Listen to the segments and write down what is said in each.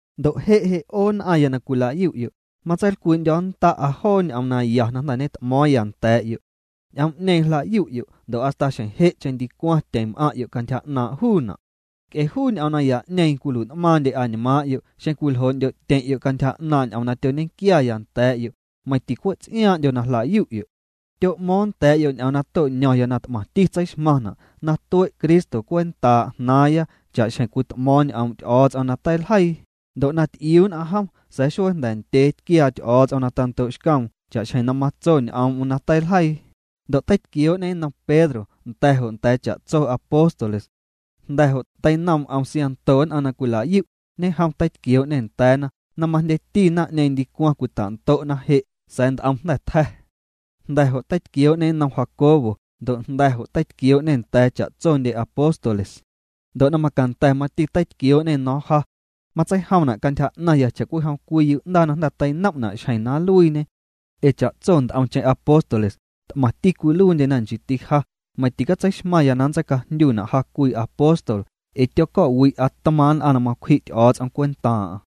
Ndo' je' je' 'o nn'aⁿya na cwila'yu'yo', matseilcwii'ndyo̱nnda'a joo ñ'oom naya na jnda̱ ñet'mo̱o̱ⁿya nda̱a̱'yo'. Ñ'oom'ñeeⁿ jla'yu'yo' ndo' hasta xjeⁿ je'cheⁿ ndicwaⁿ tyeⁿ m'aⁿ'yo' cantyja 'naaⁿ' juuna'. Nc'e juu ñ'oom naya'ñeeⁿ cwilui'n'maaⁿndye añmaaⁿ'yo' xeⁿ cwiljoo'ndyo'tyeⁿ'yo' cantyja 'naaⁿ' ñ'oom na tyoñequiaya nda̱a̱'yo', meiⁿ ticwe' ts'iaaⁿ'ndyo na jla'yu'yo'. Tyo'mo̱o̱ⁿ nda̱a̱'yo' ñ'oom na to'ño̱ⁿya na t'maⁿti tseixmaⁿna', na tue' Cristo cwentaa' jnaaⁿya cha'xjeⁿ cwit'mo̱o̱ⁿ ñ'oom' Ty'o̱o̱ts'om na teiljeii, ndo' na ty'iuu nn'aⁿ jom, sa̱a̱ xuee na jnda̱ ndyee tquiaa Ty'o̱o̱ts'om na tando'xcoom cha'xjeⁿ na matso ñ'oom'm na teiljeii, ndo' teitquioo'ñê nnom Pedro nda̱ jo' nda̱a̱ cha'tso apóstoles. Jnda̱ jo', teinoom' 'om siaⁿnto nn'aⁿ na cwila'yu', ñejom teitquioo'ñê nda̱a̱na na majndyendyeti naⁿ'ñeeⁿ ndicwaⁿ cwita'ndo'na je' sa̱a̱ nt'om jnda̱ tja̱. Jnda̱ jo' teitquiooñê nnom Jacobo ndo' jnda̱ jo' teitquioo'ñê nda̱a̱ cha'tsondye apóstoles. Ndo' na macanda̱ mati teitquioo'ñê no̱o̱ⁿ ja. Matseijomna' cantyja 'naⁿya cha'cwijom cwii yu'ndaa na jnda̱ teinom'na' xjeⁿ na nluiiñe. Ee cha'tso nt'omcheⁿ apóstoles, t'maⁿti cwiluiindyena nchiiti ja, meiⁿ ticatseixmaⁿya na nntseicajndyu'na' ja cwii apóstol ee tyoco̱'wi'a tmaaⁿ' nn'aⁿ na macwji' Ty'o̱o̱ts'om cwentaaⁿ'aⁿ.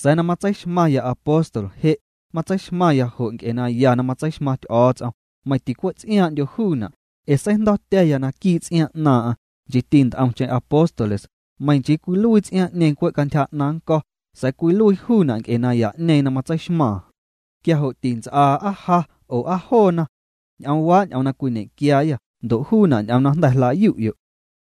Sa̱a̱ na matseixmaⁿya apóstol je', matseixmaⁿya jo' nc'e naya na matseixmaⁿ Ty'o̱o̱ts'om, meiⁿ ticwe' ts'iaaⁿ'ndyo juuna', ee seijndo̱tya̱ya naquii' ts'iaaⁿ 'naaⁿ'aⁿ, nchiiti nt'omcheⁿ apóstoles, meiⁿ nchii cwiluii ts'iaaⁿ'ñeeⁿ cwe' cantyja 'naⁿ nnco̱, sa̱a̱ cwiluii juuna' nc'e naya'ñeeⁿ na matseixmaaⁿ. Quia jo' tints'aa aa ja oo aa joona. Ñ'oomwa' ñ'oom na cwiñequiayâ, ndo' juuna' ñ'oom na jnda̱ jla'yu'yo'.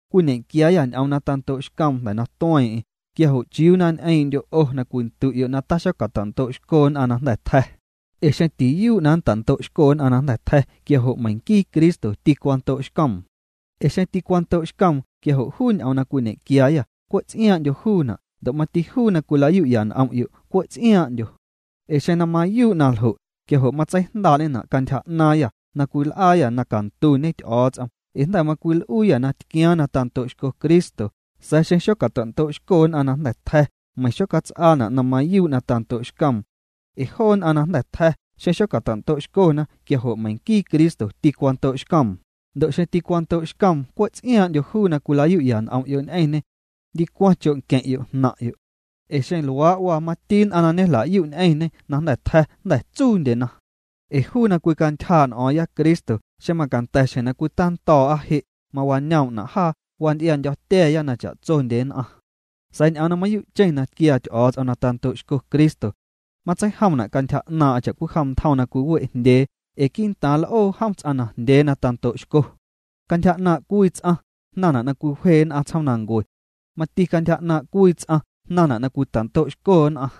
Cwiñequiaayâ ñ'oom na tando'xcoom jnda̱ na tueeⁿ'eⁿ, quia jo' ¿chiuu na ñ'eeⁿ'ndyo' 'o na cwindu'yo' na taxocata'ndo'xco nn'aⁿ na jnda̱ tja̱? Ee xeⁿ tiyuu' na nnta'ndo'xco nn'aⁿ na jnda̱ tja̱, quia jo' meiⁿ nquii Cristo tîcwando'xcoom. Ee xeⁿ tîcwando'xcoom quia jo' juu ñ'oom na cwiñequiaayâ cwe' ts'iaaⁿ'ndyo juuna' ndo' mati juu na cwila'yu'ya n'om'yo' cwe' ts'iaaⁿ'ndyo. Ee xeⁿ na mayuu' na ljo', quia jo' matseijndaa'ñena' cantyja 'naaⁿyâ na cwil'aayâ na cantuñe Ty'o̱o̱ts'om ee jnda̱ macwil'uuyâ na tquiaaⁿ na tando'xco Cristo sa̱a̱ xeⁿ xocata'ndo'xco nn'aⁿ na jnda̱ tja̱ meiⁿ xocats'aana' na mayuu' na tando'xcoom. Ee joo nn'aⁿ na jnda̱ tja̱, xeⁿ xocata'ndo'xcona, quia jo' meiⁿ nquii Cristo tîcwando'xcoom, ndo' xeⁿ tîcwando'xcoom cwe' ts'iaaⁿ'ndyo juu na cwilayu'ya n'om'yo' ñ'eⁿñê. Ndicwaⁿ cho' nqueⁿ'yo' jnaⁿ'yo'. Ee xeⁿ luaa' waa mati nn'aⁿ na ñejla'yu' ñ'eⁿñê na jnda̱ tja̱, jnda̱ tsuundye. Ee juu na cwicantyjaa' n'o̱o̱ⁿya Cristo xeⁿ macanda̱ xjeⁿ na cwitando̱o̱'a je' mawañoom'na' jaa, wanty'iaa'ndyo̱tya̱a̱ya na cha'tsondye nn'aⁿ. Sa̱a̱ ñ'oom na mayuu'cheⁿ na tquiaa Ty'o̱o̱ts'om na wando'xco Cristo. Matseijomna' cantyja 'naaⁿ'aⁿ cha'cwijom ntjom na cwiwe' jndyee ee quii'ntaaⁿ l'oo jom ts'aⁿ najndyee na tando'xco. Cantyja 'naaⁿ' cwii ts'aⁿ, jnaⁿna' na cwiwje nn'aⁿ tsjoomnancue. Mati cantyja 'naaⁿ' cwii ts'aⁿ jnaⁿna' na cwita'ndo'xco nn'aⁿ.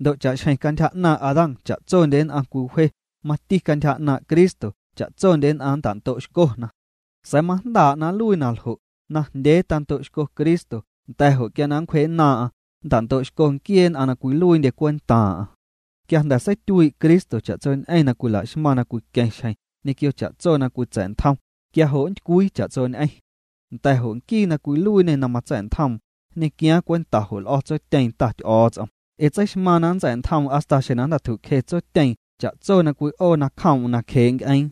Ndo' cha'xjeⁿ cantyja 'naaⁿ' Adán cha'tsondye nn'aⁿ cwiwje, mati cantyja 'naaⁿ' Cristo, cha'tsondye nn'aⁿ nnta'ndo'xcona. Sa̱a̱ majndaa' na nluii na ljo': najndyee tando'xco Cristo, nda̱ jo' quia na nncwjee'nnaaⁿ'aⁿ, nnta'ndo'xco nquiee nn'aⁿ na cwiluiindye cwentaaⁿ'aⁿ. Quia jnda̱ seityuii' Cristo cha'tsoñ'eⁿ na cwila'xmaⁿ na cwiqueⁿ xjeⁿ, ñequio cha'tso na cwitsa̱ntjom, quia jo' nntycwii cha'tsoñ'eⁿ. Nda̱ jo' nquii na cwiluiiñê na matsa̱'ntjoom, nñequiaaⁿ cwenta jo' l'o̱ Tsotyeeⁿ Ta Ty'o̱o̱ts'om. Ee tseixmaaⁿ na nntsa̱'ntjoom hasta xjeⁿ na jnda̱ tju'cje Tsotyeeⁿ nacjee' nc'eeⁿ cha'tso na cwi'oo nacjoom'm.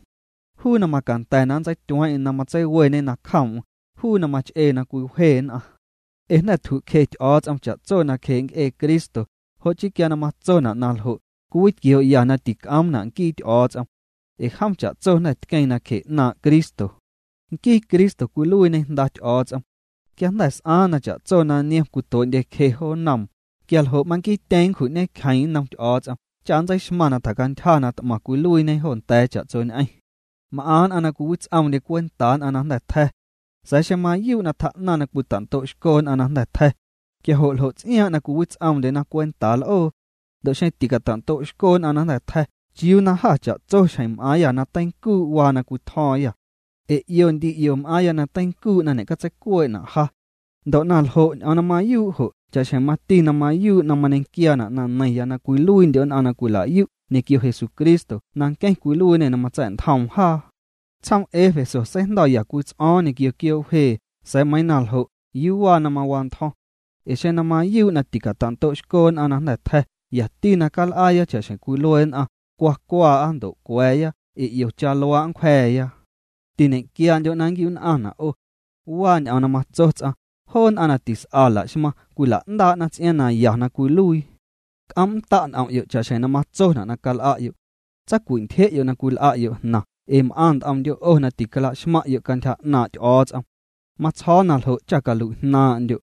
Juu na macanda̱ na nntseityueeⁿ'eⁿ na matseiweñe nacjoom'm, juu na mach'ee na cwiwje nn'aⁿ. Ee jnda̱ tju'cje Ty'o̱o̱ts'om cha'tso nacjee' nc'ee Cristo, jo' chii quia na matsona' naljo', cwiwitquioo'ya na tic'oomna' nquii Ty'o̱o̱ts'om. Ee jom cha'tso jnda̱ tqueeⁿ nacje 'naaⁿ' Cristo. Nquii Cristo cwiluiiñê Jnda Ty'o̱o̱ts'om. Quia jnda̱ s'aaⁿ na cha'tso na niom cwitue'ndyecje jo nnoom, quialjo' manquiityeeⁿ nncju'ñecjeeⁿ nnom Ty'o̱o̱ts'om cha nntseixmaⁿ na tjacantyja na t'maⁿ cwiluiiñe jo nda̱a̱ cha'tsoñ'eⁿ. M'aⁿ nn'aⁿ na cwiwits'oomndye cwentaa nn'aⁿ na jnda̱ tja̱. Sa̱a̱ xeⁿ na mayuu' tjaa'naⁿ na cwita'ndo'xco nn'aⁿ na jnda̱ tja̱, quia jo' ¿ljo' ts'iaaⁿ' na cwiwits'oomndyena cwentaa l'oo? Ndo' xeⁿ ticata'ndo'xco nn'aⁿ na jnda̱ tja̱ ¿chiuu na jâ cha'tso xjeⁿ m'aaⁿyâ na teincuu' waa na cwitjo̱o̱ⁿyâ? Ee 'io ndi 'io m'aaⁿya na teincuu' na ñe'catseicuee'na' ja. Ndo' na ljo', ñ'oom na mayuu' jo' cha'xjeⁿ mati na mayuu' na mañequiaana' na neiⁿya na cwiluiindyo' nn'aⁿ na cwila'yu' ñequio Jesucristo na nqueⁿ cwiluiiñê na matsa̱'ntjoom jaa. Tsjoom Éfeso seijndo̱ya cwii ts'o̱o̱ⁿ ñequio quioo' wje sa̱a̱ meiiⁿ na ljo' ¿yuu waa na mawantjo̱ⁿ? Ee xeⁿ na mayuu' na ticata'ndo'xco nn'aⁿ na jnda̱ tja̱ yati cal'aaya cha'xjeⁿ cwilue nn'aⁿ: “Cwa cwaa'a ndo' cwa̱a̱ya ee 'iocha luaa' nncwja̱a̱ya.” Tiñe'quiandyo' na ñe'nquiu'nn'aⁿna' 'o. Waa ñ'oom na matso ts'aⁿ: “Joo nn'aⁿ na tis'a la'xmaⁿ cwila'ndaa'na ts'iaaⁿ na ya na cwiluii.” C'oom'nnda' n'om'yo' cha'xjeⁿ na matsona' na cal'a'yo'. Tsacwi'ntyje'yo' na cwil'a'yo' jnaⁿ ee m'aⁿ nt'omndyo' 'o na ticalaxmaⁿ'yo' cantyja 'naaⁿ' Ty'o̱o̱ts'om. Matsjo̱o̱ na ljo' cha calui'jnaaⁿ'ndyo'.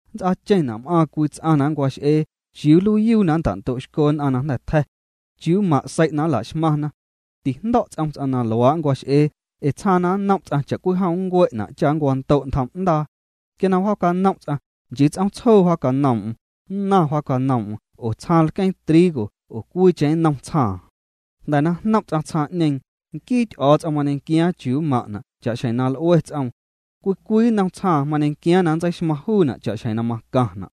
Nnts'aacheⁿna' m'aaⁿ cwii ts'aⁿ na nncwax'eeⁿ: “¿Chiuu nluiiyuu na nnta'ndo'xco nn'aⁿ na jnda̱ tja̱? ¿Chiuu mmaⁿ' sei' na nla'xmaⁿna?” Tijndo̱' ts'om ts'aⁿ na luaa' nncwax'ee, ee tsjaaⁿ na nnom' ts'aⁿ cha'cwijom nncue'na' cha nncwando' ntjom'ndaa. Quia na wjaacanom' ts'aⁿ, nchii ts'oomtsjoo wjaacanoom'm, nnaⁿ wjacanoom'm oo tsjaaⁿ lqueeⁿ trigo oo cwiicheⁿ nnom tsjaaⁿ. Jnda̱ na jnom' ts'aⁿ tsjaaⁿ'ñeeⁿ, nquii Ty'o̱o̱ts'om mañequiaaⁿ chiuu mmaⁿ'na' cha'xjeⁿ na l'ue ts'oom. Cwii cwii nnom tsjaaⁿ mañequiaaⁿ na nntseixmaⁿ juuna' cha'xjeⁿ na macaⁿna'.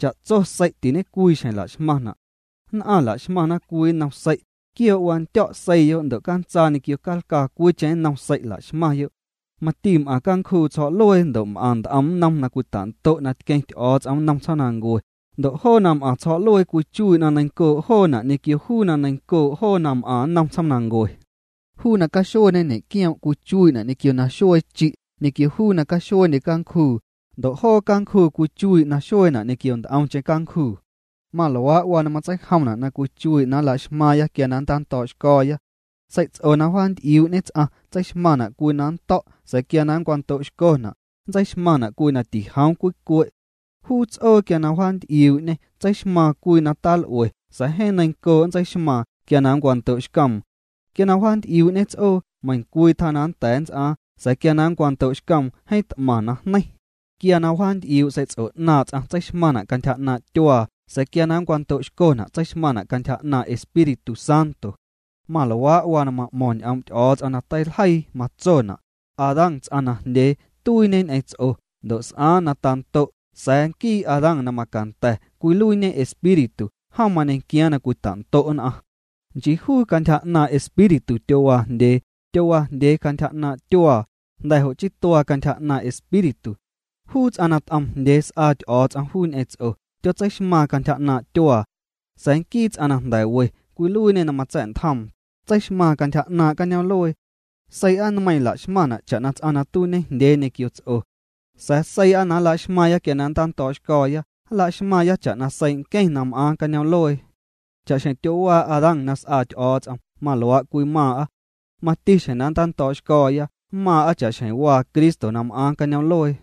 Cha'tso sei' tiñecwii xjeⁿ la'xmaⁿna'. Nn'aⁿ la'xmaⁿna cwii nnom sei', quioo' wandyo̱' seiiyo' ndo' cantsaa ñequio calcaa cwiicheⁿ nnom sei' la'xmaⁿyo'. Mati m'aⁿ cancjuu tsjo̱'luee ndo' m'aⁿ nt'om nnom na cwita'ndo' na tqueⁿ Ty'o̱o̱ts'om nnom tsjoomnancue, ndo' joo na m'aⁿ tsjo̱'luee cwichuii' na neiⁿncoo' joona' ñequio juu na neiⁿncoo' joo na m'aⁿ nnom tsjoomnancue. Juu na caxueeñe ñe'quioom' cwichuii'na' ñequio na xuee chi' ñequio juu na caxueendye cancjuu, ndo' joo cancjuu cwichuii' na xueena' ñequio nt'omcheⁿ cancjuu. Maluaa' waa na matseijomna' na cwichuii' na nla'xmaaⁿya quia na nntando̱'xco̱o̱ya. Sei'ts'o na wjaanty'iuu'ñe ts'aⁿ tseixmaⁿna' cwii na nto̱' sa̱a̱ quia na nncwando'xcona', nntseixmaⁿna' cwii na tijoom cwii cue'. Juu ts'oo na nncjanty'iuu' tseixmaⁿna' cwii na tal'ue sa̱a̱ jeeⁿ neiⁿncoo' tseixmaⁿna' quia na nncwando'xcoom. Quia na wjaanty'iuu'ñe ts'oo, meiⁿcwii tjaa na nnda̱a̱ nnts'aaⁿ, sa̱a̱ quia na nncwando'xcoom jeeⁿ t'maⁿ najneiⁿ. Quia na wjaanty'iuu' sei'ts'o 'naaⁿ' ts'aⁿ tseixmaⁿna' cantyja 'naaⁿ' tyuaa, sa̱a̱ quia na nncwando'xcona' tseixmaⁿna' cantyja 'naaⁿ' Espíritu Santo. Maluaa' waa na ma'mo̱ⁿ ñ'oom' Ty'o̱o̱ts'om na teiljeii, matsona': “Adán ts'aⁿ najndyee, tuiiñe ñ'eⁿ ts'o ndo' s'aaⁿ na tando'”, sa̱a̱ nquii Adán na macanda̱ cwiluiiñe Espíritu, jom mañequiaaⁿ na cwita'ndo' nn'aⁿ. Nchii juu cantyja 'naaⁿ' Espíritu tyowaajndyee, tyowaajndyee cantyja 'naaⁿ' tyuaa, jnda̱ jo' chii tuaa cantyja 'naaⁿ' Espíritu. Juu ts'aⁿ na t'oomjndyee s'aa Ty'o̱o̱ts'om juu ñ'eⁿ ts'o, tyotseixmaaⁿ cantyja 'naaⁿ' tyuaa. Sa̱a̱ nquii ts'aⁿ na jnda̱ we cwiluiiñê na matsa̱'ntjoom, tseixmaaⁿ cantyja 'naaⁿ' cañoom'luee. Seii'a nmeiiⁿ la'xmaⁿna' cha'na ts'aⁿ na tuiiñejndyee ñequio ts'o. Sa̱a̱ seii'a na nlaxmaaⁿya quia na nntando̱o̱'xco̱o̱ya nlaxmaaⁿya cha'na seii' nqueⁿ na m'aaⁿ cañoom'luee. Cha'xjeⁿ tyowaa Adán na s'aa Ty'o̱o̱ts'om maluaa' cwimaaⁿ'a. Mati xjeⁿ na nntando̱o̱'xco̱o̱ya mmaaⁿ'a cha'xjeⁿ waa Cristo na m'aaⁿ cañoom'luee.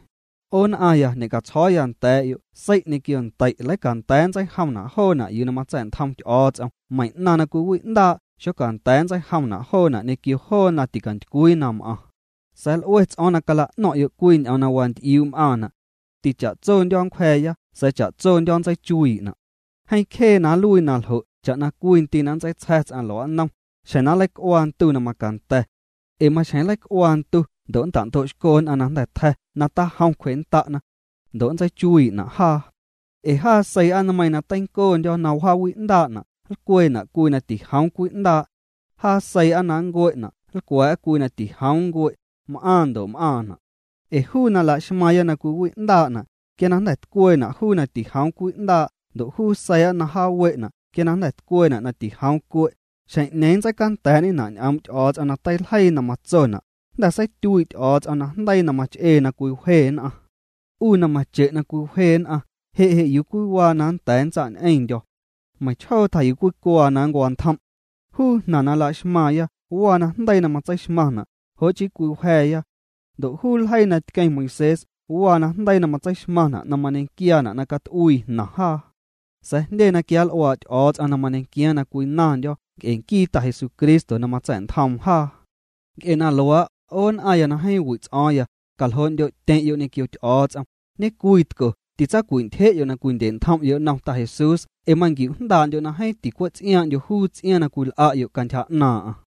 'O nn'aⁿya, ñe'catsjo̱o̱ya nda̱a̱'yo' sei' ñequio ndei' leicanda̱a̱ nntseijomna' joona' yuu na matsa̱'ntjom Ty'o̱o̱ts'om meiⁿ 'naⁿ na cwiwi'ndaa' xocanda̱a̱ nntseijomna' joona' ñequio joo na ticantycwii na m'aⁿ. Sa̱a̱ l'ue ts'o̱o̱ⁿ na nla'no̱ⁿ'yo' cwii ñ'oom na wanty'iuu' m'aⁿna'. Ticha'tsondyo̱ nncwja̱a̱ya sa̱a̱ cha'tsondyo̱ nntseichuiina'. Jeeⁿ cjee na nluii na ljo' cha'na cwii ndii' na nntseitsja̱ ts'aⁿ lua'nnom, xjeⁿ na nleic'uaa ndu na macanda̱. Ee maxjeⁿ nleic'uaa ndu ndo' nnta'ndo'xco nn'aⁿ na jnda̱ tja̱ na tajom cwjennda'na. Ndo' nntseichuii'na' jaa. Ee jaa seii'a nmeiiⁿ na teincoondyo̱ na wjaawi'ndaa'na' nlcwee'na' cwii na tijoom cwi'ndaa'. Jaa seii'a na nncue'na' nlcwa̱a̱'a cwii na tijoom ncue', m'aaⁿ ndo' m'aaⁿna'. Ee juu na laxmaaⁿya na cwiwi'ndaa'na', quia na jnda̱ tcweena' juu na tijoom cwi'ndaa' ndo' juu seii'a na jaawe'na' quia na jnda̱ tcweena' na tijoom cue', xjeⁿ'ñeeⁿ nntseicanda̱a̱'ñena' ñ'oom' Ty'o̱o̱ts'om na teiljeii na matsona': “Jnda̱ seityuii' Ty'o̱o̱ts'om najndeii na mach'ee na cwiwje nn'aⁿ. 'U na mache' na cwiwje nn'aⁿ, ¿je' je' yuu waa na cwii nnda̱a̱ ntsa' ñ'eⁿndyo̱? Meiⁿchjoo tjaa yuu cwii cuaa na ncwantjom'.” Juu jnaⁿ na laxmaaⁿya waa najndeii na matseixmaⁿna', jo' chii cwiwja̱a̱ya. Ndo' juu ljeii na tqueⁿ Moisés waa najndeii na matseixmaⁿna' na mañequiaana' na cat'uii jnaⁿ jaa. Sa̱a̱ jndye na quianl'uaa' Ty'o̱o̱ts'om na mañequiaaⁿ na cwinaⁿndyo̱ nc'e nquii Ta Jesucristo na matsa̱'ntjoom jaa. Nc'e na luaa', 'o nn'aⁿya na jeeⁿ wi' ts'o̱o̱ⁿya, caljoo'ndyo'tyeⁿ'yo' ñequio Ty'o̱o̱ts'om, ñecwiitco titsawintyje'yo' na cwindye'ntjom'yo' nnom Ta Jesús ee manquiu'jndaa'ndyo' na jeeⁿ ticwe' ts'iaaⁿ'ndyo juu ts'iaaⁿ nats'aⁿ nnoom.